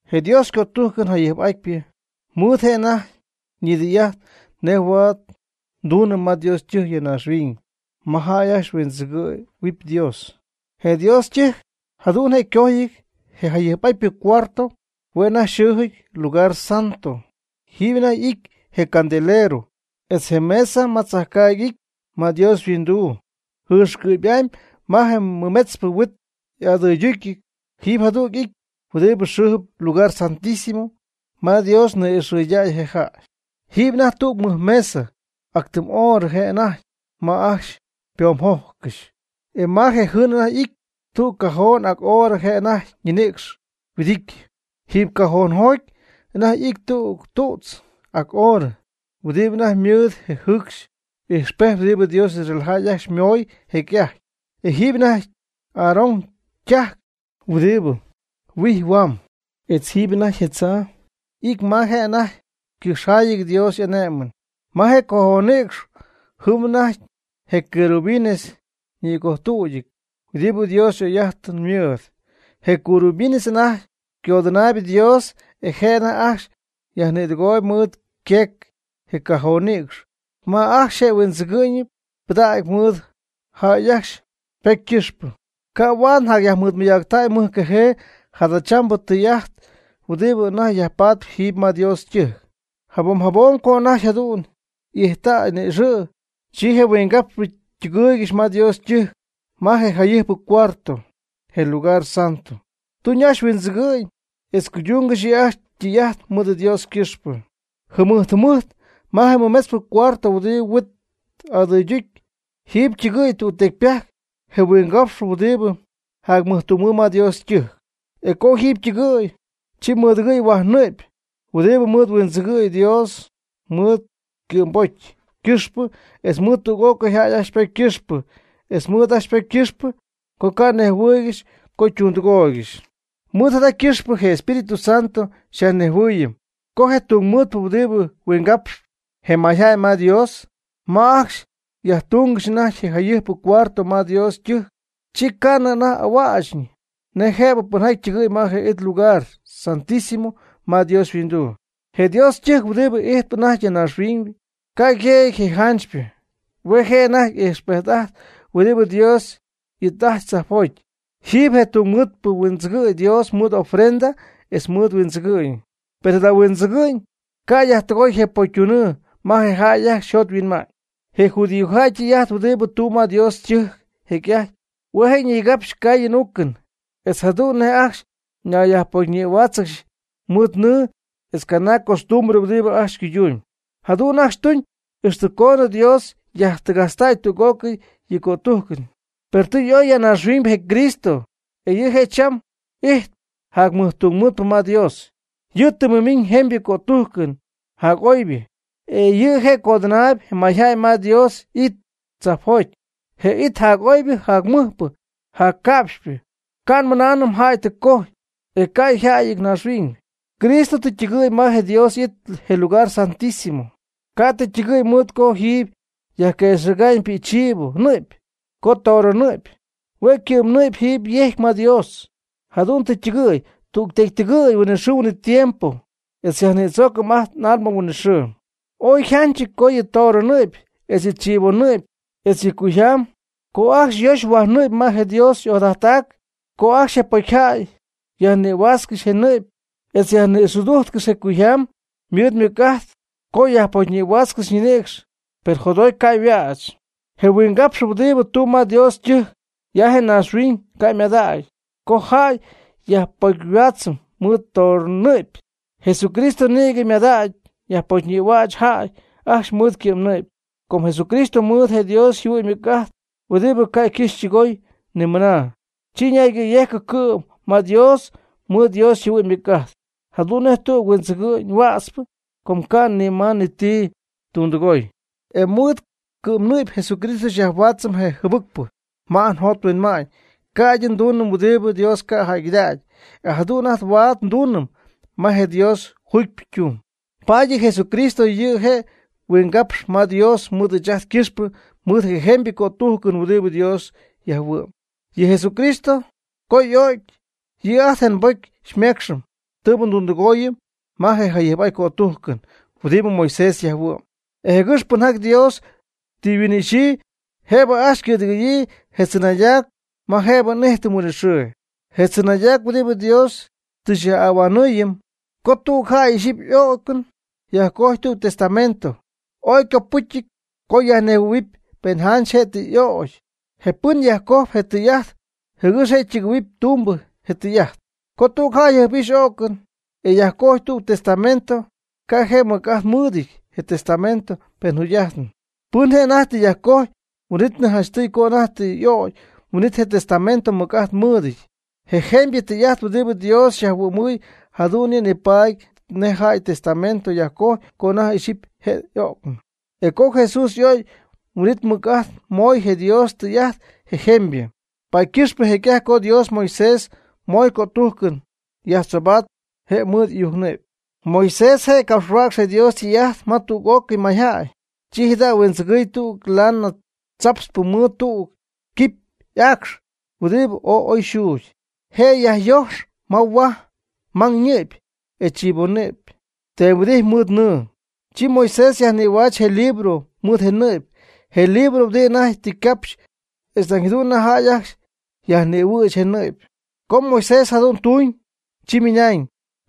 Je Dios ycötujcɨn jayɨjp'atypɨ ymɨɨd je' anajty ñidɨy'ajt nej huaad ytuñ ma Dios ytɨjc ya naaxhuiñ, ma jäy ajcxy huindzɨgɨ̈huɨpy Dios. Je Dios ytɨjc jadu'n je' ycojɨty. Je jayɨjpɨ cuarto hue' anajty xɨɨjɨty Lugar Santo, jiiby anajty y'ity je candelero etz je mesa ma tzajcaagy y'ity ma Dios yhuinduu. Jɨɨxcɨ'py'amy ma je mɨmetzpɨ huit y'agɨyducyɨty jiiby jadüg'it huɨdibɨ xɨɨjɨp Lugar Santísimo (ma Dios ni'ixcɨdägy je jäy). Jiiby anajty tüg mɨj mesa ac tɨm orɨ je' anajty ma ajcxy ypoomjojccɨxy, e ma je' jɨm anajty y'ity tüg cajoon ac orɨ je' anajty yñinïcx huɨdityɨ. Jiiby cajoonjoty anajty y'ity tüg tu'tz ac orɨ huɨdibɨ anajty mɨɨd je jɨcxy ijxpejt huɨdibɨ Dios Israel jäy ajcxy ymooy jecy'ajty. Etz jiiby anajty Aarón ytajc huɨdibɨ huijp huam. Etz jiiby anajty je tzaa y'ity ma je' anajty ycɨjxjayɨty Dios y'ane'mɨn. Ma je cajoonnïcx jɨm anajty je querubines ñïgojtüdyɨty huɨdibɨ Dios y'oy'ajtɨn mɨɨd. Je querubines anajty codɨnaayb Dios, e je' anajty ajcxy yajnïdɨgooyb mɨɨd yqueec je cajonnïcx ma ajcxy je huɨdzɨgɨ'ñ ñɨ'py ypɨdacy mɨɨd jäy ajcxy ypocy ycɨxpɨ. Ca' huaad yjacyajnimɨydacy mɨjcajee jadachambɨ tijaty huɨdibɨ anajty yajpatp jiiby ma Dios ytɨjc. Jabom jabom co anajty jadu'n y'ijttäy ni'ixɨ', chi je huingapxpɨ ytɨgɨɨygɨxy ma Dios ytɨjc ma je jayɨjpɨ cuarto, je Lugar Santo, tuñ ajcxy huindzɨgɨ'ñ etz cuydungɨxy yɨ' ajcxy ytɨy'ajt mɨɨd Dios ycɨxpɨ. Jɨmɨjt jɨmɨjt ma je mɨmetzpɨ cuarto huɨdibɨ je huit adɨydujcp, jiiby ytɨgɨ̈y tügtecypajc je huingapxpɨ huɨdibɨ jacmɨjtungmɨɨd ma Dios ytɨjc. E co jiiby ytɨgɨ̈y, chi mɨdɨgɨy huaj ñɨ'py, huɨdibɨ mɨɨd huindzɨgɨɨy Dios mɨɨd ycɨ'mbocy ycɨxpɨ etz mɨɨd tüg'ócɨy jäy ajcxy ypocy ycɨxpɨ etz mɨɨd ajcxy ypocy ycɨxpɨ co ca' nejhuɨɨygɨxy co ytundɨgooygɨxy. Mɨɨd jada ycɨxpɨ je Espíritu Santo xyajnejhuɨɨyɨm co je tungmɨɨdpɨ huɨdibɨ huingapxɨ je mayjäy ma Dios, ma ajcxy jacyajtungɨxy anajty je jayɨjp cuarto ma Dios ytɨjc, chi ca'nɨ je' anajty y'ahuächñɨ nej jëbɨ pɨnjaty ytɨgɨ̈y ma je it lugar Santísimo ma Dios yhuinduu. Je Dios ytɨjc huɨdibɨ ijtp anajty ya naaxhuiñ ca' je' yjëjɨty je janchypɨ. Hue' je' anajty ijxpejt'ajtp huɨdi Dios y'it'ajtpy tzajpjoty. Jiiby je tungmɨɨdpɨ huindzɨgɨ̈y Dios mɨɨd ofrendas etz mɨɨd huindzɨgɨ'ñ. Per jada huindzɨgɨ'ñ ca' yajtɨgoy je pocytunɨɨ ma je jäy ajcxy yjot yhuinma'ñ. Je judíojäy ytɨy'ajt huɨdibɨ tuun ma Dios ytɨjc jecy'ajty, hue' je' ñigapxy caayɨn uucɨn, etz jadu'n nej ajcxy ñayyajpocyñïhuáatzɨgɨxy mɨɨd nɨɨ etz canaag costumbre huɨdibɨ ajcxy cuydumyb. Jadu'n ajcxy ytuñ ixtɨ coonɨ Dios yajtɨgajtztay tüg'ócɨy yɨ' ycötujcɨn. Per tɨ y'oy ya naaxhuiñ je Cristo, e yɨ' je' cham ijtp jacmɨjtungmɨɨdpɨ ma Dios, yɨ' tɨ mɨmiñ jemybɨ cötujcɨn jac'oybɨ. E yɨ' je' codɨnaayb je mayjäy ma Dios y'it tzajpjoty, je it jac'oybɨ jacmɨjpɨ, jacca'pxypɨ, ca' nmɨnaanɨm jäy tɨ cojy, e ca' yaajɨty naaxhuiñ. Cristo tɨ ytɨgɨ̈y ma je Dios y'it, je lugar Santísimo. Ca' tɨ ytɨgɨ̈y mɨɨd co jiiby yajquëxɨ̈ga'ñ pi'cchivo ñɨ'py o toro ñɨ'py, hue' ycɨ'mnɨ'py jiiby yejcpy ma Dios. Jadu'n tɨ ytɨgɨ̈y tügtecy tɨgɨ̈y huinɨxɨɨ huinɨtiempo, etz xyyajnïdzoocɨm ajt n'alma huinɨxɨɨ. Ooy yjanchɨty co yɨ toro ñɨ'py etz je chivo ñɨ'py etz yɨ cuyjam co ajcxy nöccɨxy huaj nɨɨx ma je Dios ojadajttac, co ajcxy je pocyjäy yajnïhuäxcɨxy je nɨ'py etz yajnïxɨdujtcɨxy je cuyjam ymɨɨd mɨc'ajt co yajpocyhuáatzɨgɨxy ñinïcx, per jotjoty ca' yajhuäch. (Je huingapxpɨ huɨdibɨ tumb ma Dios ytɨjc ya naaxhuiñ ca' ymadägy co jäy yajpocyhuädzɨpy mɨɨd toro ñɨ'py), Jesucristo nïgɨ tɨ ymadägy yajpocyhuäch jäy ajcxy mɨɨd ycɨ'mnɨ'py. Com Jesucristo ymɨɨd je Dios yjɨhuɨ'ñ ymɨc'ajt huɨdibɨ ca' ycɨxɨpy ytɨgoyɨpy ni mɨna, chi ñaygɨ̈yejcɨ cɨ'm ma Dios mɨɨd Dios yjɨhuɨ'ñ ymɨc'ajt, jadu'n nej tüg huindzɨgɨ'ñ huätzpɨ, com ca' ni ma ni ti tundɨgoy. E mɨɨd ycɨ'mnɨ'py Jesucristo xyajhuaatzɨm je jɨbɨcpɨ ma ajt njot nhuinma'ñ, ca'ydɨ ndunɨm huɨdibɨ Dios ca' jäygɨdägy, e jadu'n ajt huaad ndunɨm ma je Dios juugypɨ ytung. Paady yɨ Jesucristo yɨ' je' huingapx'ajtp ma Dios mɨɨd ɨɨch ajt ycɨxpɨ mɨɨd je jemybɨ ycötujcɨn huɨdibɨ Dios yajhuɨ'm. Yɨ Jesucristo co y'o'cy, yɨ' ajt je' nbocy xymeecxɨm tɨɨbɨ ndundɨgooyɨm ma je jayɨjp'atyp cötujcɨn huɨdibɨ Moisés jayhuɨ'm. E jɨgɨx pɨnjaty Dios tɨ yhuin'ixyii, jëbɨ ajcxy ycɨ̈dɨgɨ̈yii je tzɨnaydac ma jëbɨ n'ijtɨm huinɨxɨɨ. Je tzɨnaydac huɨdibɨ Dios tɨ xy'ahuanɨɨyɨm. Co tüg jäy jɨjp'ixy y'o'cɨn, e yajcojy tüg testamento, ooy ycopɨcyɨty co yajnejhuɨ̈huɨpy pen janch je' tɨ y'ögy je pɨn yajcoj je tɨy'ajt jɨgɨx je' ytɨgɨ̈huɨpy tumbɨ je tɨy'ajt. Co tüg jäy jɨjp'ixy y'o'cɨn e yajcojy tüg testamento, ca' je' ti mɨc'ajt mɨɨdɨty je testamento pen jugy'ajtnɨ pɨn je' anajty tɨ yajcojy. Huin'ítnɨ janchtɨy co anajty tɨ y'ögy, huin'it je testamento mɨc'ajt mɨɨdɨty. Je jemybɨ tɨy'ajt huɨdibɨ Dios xyajhuɨ'my jadu'n yɨ' nipaady nej jäy testamento yajcojy co anajty jɨjp'ixy je y'o'cɨn, e co Jesús y'o'cy, huin'it mɨc'ajt moy je Dios ytɨy'ajt je jemybɨ. Paady ycɨxpɨ jecy'ajty co Dios Moisés moy cötujcɨn, yajtzoobaat je' mɨɨd ɨyujc ñɨ'py. Moisés je' capxhuäcx je Dios ytɨy'ajt ma tüg'ócɨy mayjäy. Chi jada' huijtzɨ̈gy tüg lana tzaptzpɨ mɨɨd tüg quipy aacx huɨdibɨ ooy oy yxuugy. Je' yajxooc ma huaj mang ñɨ'py etz chivo ñɨ'py teemhuɨdity mɨɨd nɨɨ, chi Moisés yajnïhuɨ'ch je libro mɨɨd je nɨ'py, je libro huɨdibɨ anajty tɨ capxy etz nañ jadu'n jäy ajcxy yajnïhuɨ'ch je nɨ'py. Co Moisés jadu'n ytuuñ, chi ymɨnañ: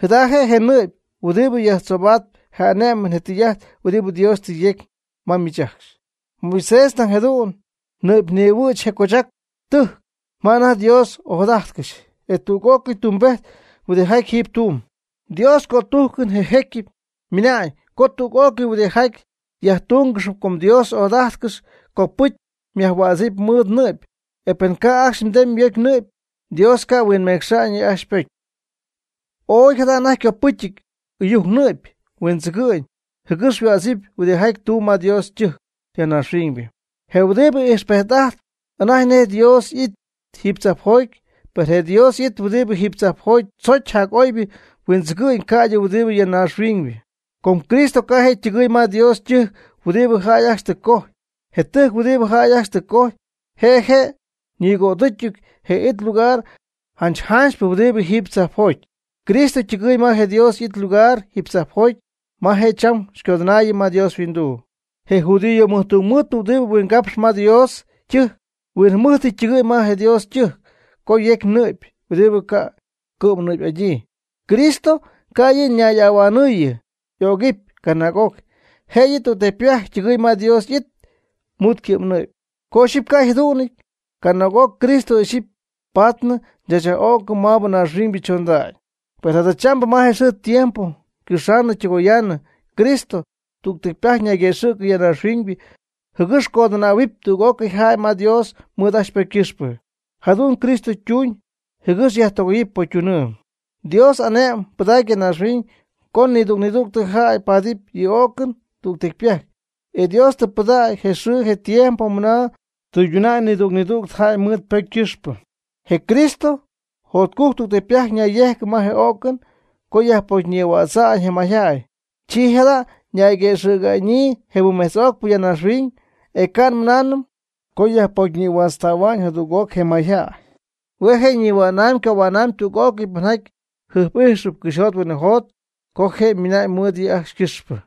“Jada je' je nɨ'py huɨdibɨ yajtzoobatp je ane'mɨn je tɨy'ajt huɨdibɨ Dios tɨ yecy ma miich ajcxy.” Moisés nañ jadu'n ñɨ'pyñïhuɨ'ch je cochac tɨjc ma anajty yDios ojadajtcɨxy, e tüg'ócɨy tumbejt huɨdijaty jiiby tumb. Dios ycötujcɨn, je jecyɨp, ymɨna'ñ co tüg'ócɨy huɨdijaty yajtungɨxyp co Dios ojadajtcɨxy, copɨcy yajhuädzɨpy mɨɨd nɨ'py. E pen ca' ajcxy teemy yocy nɨ'py, Dios ca' huinmecxa'ñ yɨ' ajcxy ypocy. Ooy jada anajty ycopɨcyɨty ɨyujc ñɨ'py huindzɨgɨ'ñ, jɨgɨx yhuädzɨp huɨdijaty tumb ma Dios ytɨjc ya naaxhuiñ, je huɨdibɨ ijxpejt'ajtp anajty nej Dios y'it jiiby tzajpjoty. Per je Dios y'it huɨdibɨ jiiby tzajpjoty chojcpy jac'oybɨ huindzɨgɨ'ñ ca'ydɨ huidɨ ya naaxhuiñ. Com Cristo ca' je' ytɨgɨ̈y ma Dios ytɨjc huɨdibɨ jäy ajcxy tɨ cojy. Je tɨjc huɨdibɨ jäy ajcxy tɨ cojy, je' je' ñigojtuutɨn je it lugar janch janchypɨ huɨdi jiiby tzajpjoty. Cristo tɨgɨɨy ma je Dios y'it ylugar jiiby tzajpjoty, ma je' cham xycodɨnaayɨm ma Dios yhuinduu. Je judío mɨjtungmɨɨdpɨ huɨdibɨ huingapxp ma Dios ytɨjc, huinjɨmɨjtɨty ytɨgɨ̈y ma je Dios ytɨjc co yecy nɨ'py huɨdibɨ ca' cɨ'mnɨ'py'adyii. Cristo ca' yɨ' ñay'ahuanɨ̈yii y'ögɨpy canaag'oc, jëyɨ tügtecypajc ytɨgɨɨy ma Dios y'it mɨɨd ycɨ'mnɨ'py. Co ixyipy ca' yjadu'nɨty, canaag'oc Cristo ixyipy patnɨ chaachy'öcɨn maabɨ naaxhuiñybɨ chondagy. Per jadachambɨ ma xɨɨ tiempo ycɨxaanɨ ytɨgoyaanɨ, Cristo tügtecypajc ñayguëxɨ̈cɨ ya naaxhuiñ, jɨgɨx codɨnähuɨpy tüg'ócɨy jäy ma Dios mɨɨd ajcxy ypocy ycɨxpɨ. Jadu'n Cristo tuuñ jɨgɨx yajtɨgoyɨpy pocytunɨɨ. Dios ane'mɨn pɨdac ya naaxhuiñ co nidüg nidüg jäy paadɨp yɨ o'cɨn tügtecypajc. E Dios tɨ pɨdägy je xɨɨ je tiempo mɨna tɨyduna'ñ nidüg nidüg jäy mɨɨd ypocy ycɨxpɨ. Je Cristo jotcujc tügtecypajc nayyejcɨ ma je o'cɨn co yajpocyñïhuaatztäy je mayjäy. Chi jada' ñayguëxɨ̈ga'ñyii je mɨmejtz'ocpɨ ya naaxhuiñ, e ca' nmɨnaanɨm co yajpocyñïhuaatzaanɨp jadüg'oc je mayjäy, hue' je' nihua'namyb ycohua'namyb tüg'ócɨy pɨnjaty jɨjp'ijxɨp cɨxyjot huinɨjot co je' miina'ñ mɨɨd yɨ' ajcxy ycɨxpɨ.